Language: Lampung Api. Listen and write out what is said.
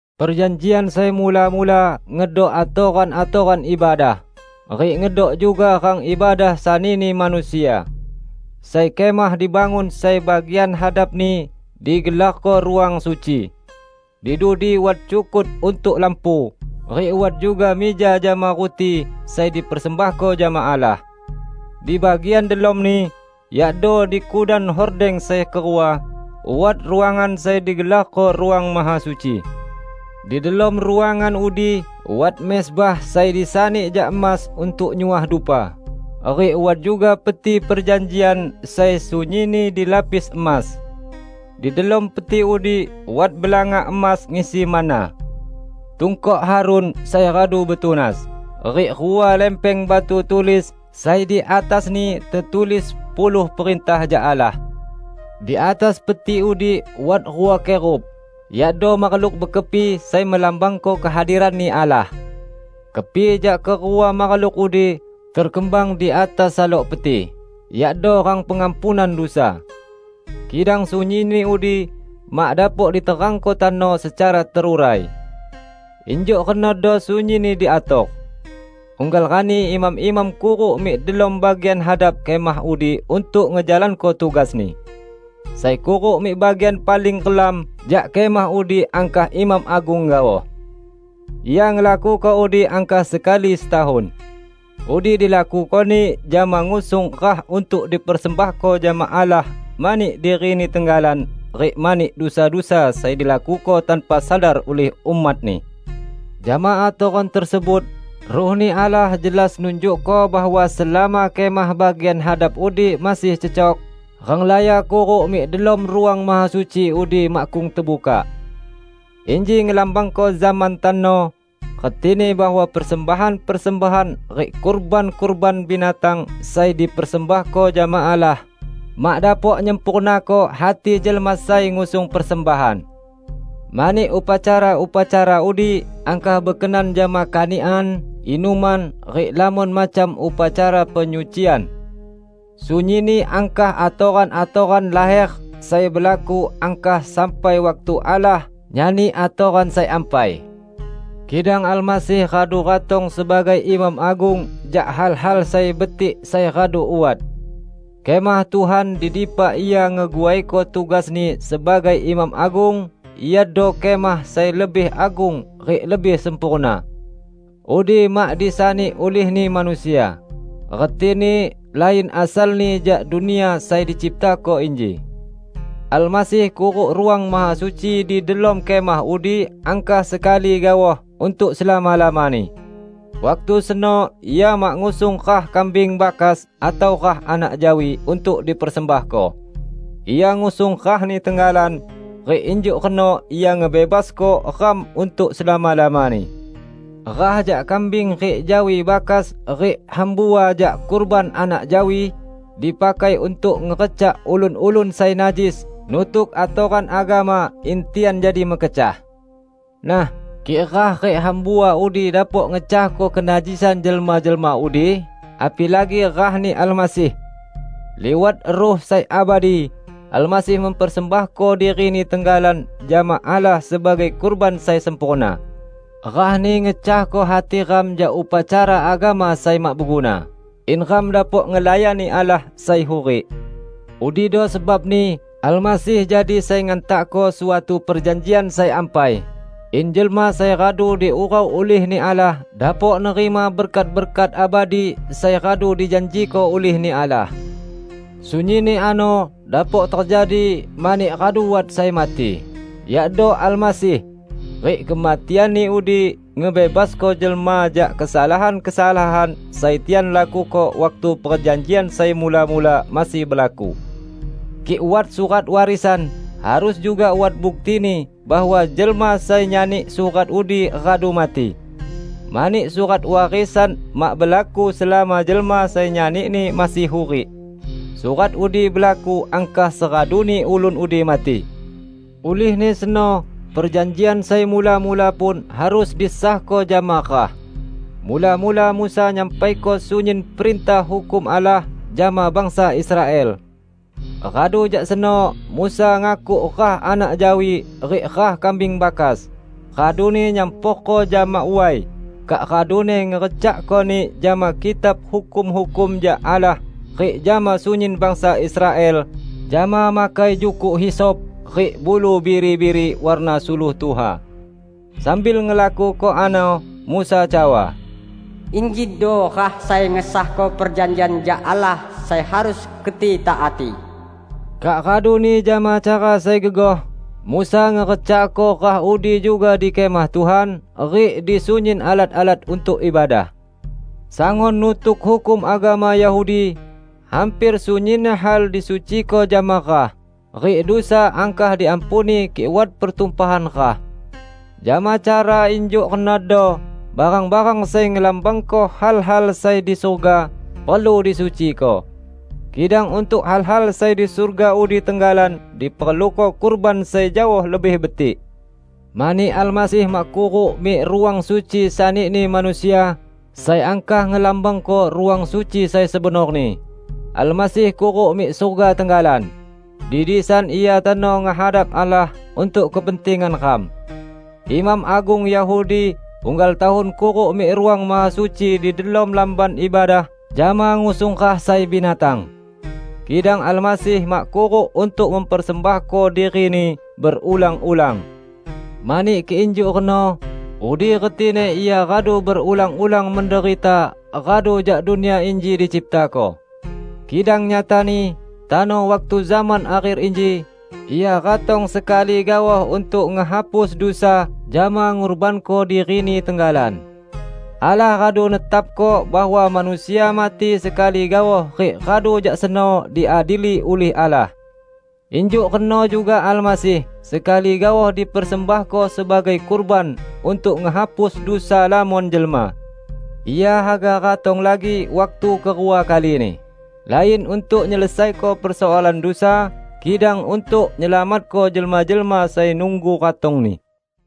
Perjanjian sai mula-mula ngedok atoran-atoran ibadah, rik ngedok juga rang ibadah sanini manusia. Sai kemah dibangun sai bagian hadapni digelarko Ruang Suci. Di dudi wat cukut untuk lampu, rik wat juga mija jama ruti sai dipersembahko jama Allah. Di bagian delomni, yakdo di kudan hordeng sai kerua, wat ruangan sai digelarko Ruang Mahasuci. Di delom ruangan udi wat mezbah sai disani jak emas untuk nyuah dupa, rik wat juga Peti Perjanjian sai sunyinni dilapis emas. Di delom Peti udi wat belanga emas ngisi manna, tungkok Harun sai radu betunas, rik rua lempeng batu tulis sai di atasni tetulis puluh perintah jak Allah. Di atas Peti udi wat rua Kerub, yakdo makhluk bekepi sai melambangko kehadiran-Ni Allah. Kepi jak kerua makhluk udi terkembang di atas salok Peti, yakdo rang pengampunan dusa. Kidang sunyinni udi mak dapok diterangko tano secara terurai. Injuk renodo sunyinni diator. Unggal rani imam-imam kuruk mik delom bagian hadap kemah udi untuk ngejalanko tugasni. Sai kuruk mik bagian paling relam jak kemah udi angkah imam agung gaoh. Ia ngelakuko udi angkah sekali setahun. Udi dilakukoni jama ngusung rah untuk dipersembahko jama Allah mani dirini tenggalan rik mani dusa-dusa sai dilakuko tanpa sadar ulih umat-Ni. Jama atoran tersebut, Ruh-Ni Allah jelas nunjukko bahwa selama kemah bagian hadap udi masih cecok, renglaya kuruk mik delom Ruang Mahasuci udi makkung tebukak. Inji ngelambangko zaman tano; retini bahwa persembahan-persembahan rik kurban-kurban binatang sai dipersembahko jama Allah, mak dapok nyempurnako hati jelma sai ngusung persembahan. Mani upacara-upacara udi angkah bekenan jama kanikan, inuman, rik lamon macam upacara penyucian. Sunyinni angkah atoran-atoran laher sai belaku angkah sampai waktu Allah nyani atoran sai ampai. Kidang Almasih radu ratong sebagai Imam Agung jak hal-hal sai betik sai radu wat. Kemah Tuhan di dipa Ia ngeguaiko tugas-Ni sebagai Imam Agung iado kemah sai lebih agung rik lebih sempurna. Udi mak disani ulihni manusia; retini lain asalni jak dunia sai diciptako inji. Almasih kuruk Ruang Mahasuci di delom kemah udi angkah sekali gaoh untuk selama-lamani. Waktu seno Ia mak ngusung rah kambing bakas atau rah anak jawi untuk dipersembahko; ia ngusung rah-Ni tenggalan, rik injuk reno Ia ngebebasko ram untuk selama-lamani. Rah jak kambing rik jawi bakas rik hambua jak kurban anak jawi, dipakai untuk ngerecak ulun-ulun sai najis nutuk atoran agama in tian jadi mekecah. Nah, kik rah rik hambua udi dapok ngecahko kenajisan jelma-jelma udi, apilagi rah-Ni Almasih! Liwat Ruh sai abadi, Almasih mempersembahko diri-Ni tenggalan jama Allah sebagai kurban sai sempurna. Rah-Ni ngecahko hati ram jak upacara agama sai mak beguna, in ram dapok ngelayani Allah sai hurik. Udido sebabni Almasih jadi Sai Ngantakko suatu perjanjian sai ampai, in jelma sai radu diurau ulih-Ni Allah dapok nerima berkat-berkat abadi sai radu dijanjiko ulih-Ni Allah. Sunyinni ano dapok tejadi mani radu wat sai mati, yakdo Almasih; rik kematian-Ni udi ngebebasko jelma jak kesalahan-kesalahan sai tian lakuko waktu perjanjian sai mula-mula masih belaku. Kik wat surat warisan, harus juga wat buktini bahwa jelma sai nyani surat udi radu mati. Mani surat warisan mak belaku selama jelma sai nyanini masih hurik. Surat udi belaku angkah seraduni ulun udi mati. Ulihni seno perjanjian sai mula-mula pun harus disahko jama rah. Mula-mula Musa nyampaiko sunyin perintah hukum Allah jama bangsa Israel. Radu jak seno Musa ngakuk rah anak jawi rik rah kambing bakas, raduni nyamporko jama way, kak raduni ngerecakkoni jama Kitab Hukum-hukum jak Allah rik jama sunyin bangsa Israel jama makai jukuk hisop rik bulu biri-biri warna suluh tuha. Sambil ngelakuko ano Musa cawa, "Injido rah sai ngesahko perjanjian jak Allah sai harus keti taati." Kak raduni jama cara sai gegoh, Musa ngerecakko rah udi juga di Kemah Tuhan rik di sunyin alat-alat untuk ibadah. Sangun nutuk hukum agama Yahudi, hamper sunyin hal disuciko jama rah; rik dusa angkah diampuni kik wat pertumpahan rah. Jama cara injuk renodo barang-barang sai ngelambangko hal-hal sai di surga, perlu disuciko. Kidang untuk hal-hal sai di surga udi tenggalan diperluko kurban sai jaoh lebih betik. Mani Almasih mak kuruk mik Ruang Suci sanini manusia, sai angkah ngelambangko Ruang Suci sai sebenorni. Almasih kuruk mik surga tenggalan; di disan Ia tano ngehadap Allah untuk kepentingan ram. Imam agung Yahudi unggal tahun kuruk mik Ruang Mahasuci di delom Lamban Ibadah jama ngusung rah sai binatang. Kidang Almasih mak kuruk untuk mempersembahko diri-Ni berulang-ulang. Mani kik injuk reno, udi retini Ia radu berulang-ulang menderita radu jak dunia inji diciptako. Kidang nyatani, tano waktu zaman akher inji, Ia ratong sekali gaoh untuk ngehapus dusa jama ngurbanko diri-Ni tenggalan. Allah radu netapko bahwa manusia mati sekali gaoh rik radu jak seno diadili ulih Allah. Injuk reno juga Almasih sekali gaoh dipersembahko sebagai kurban untuk ngehapus dusa lamon jelma. Ia haga ratong lagi waktu kerua kalini, lain untuk nyelesaiko persoalan dusa, kidang untuk nyelamatko jelma-jelma sai nunggu ratong-Ni.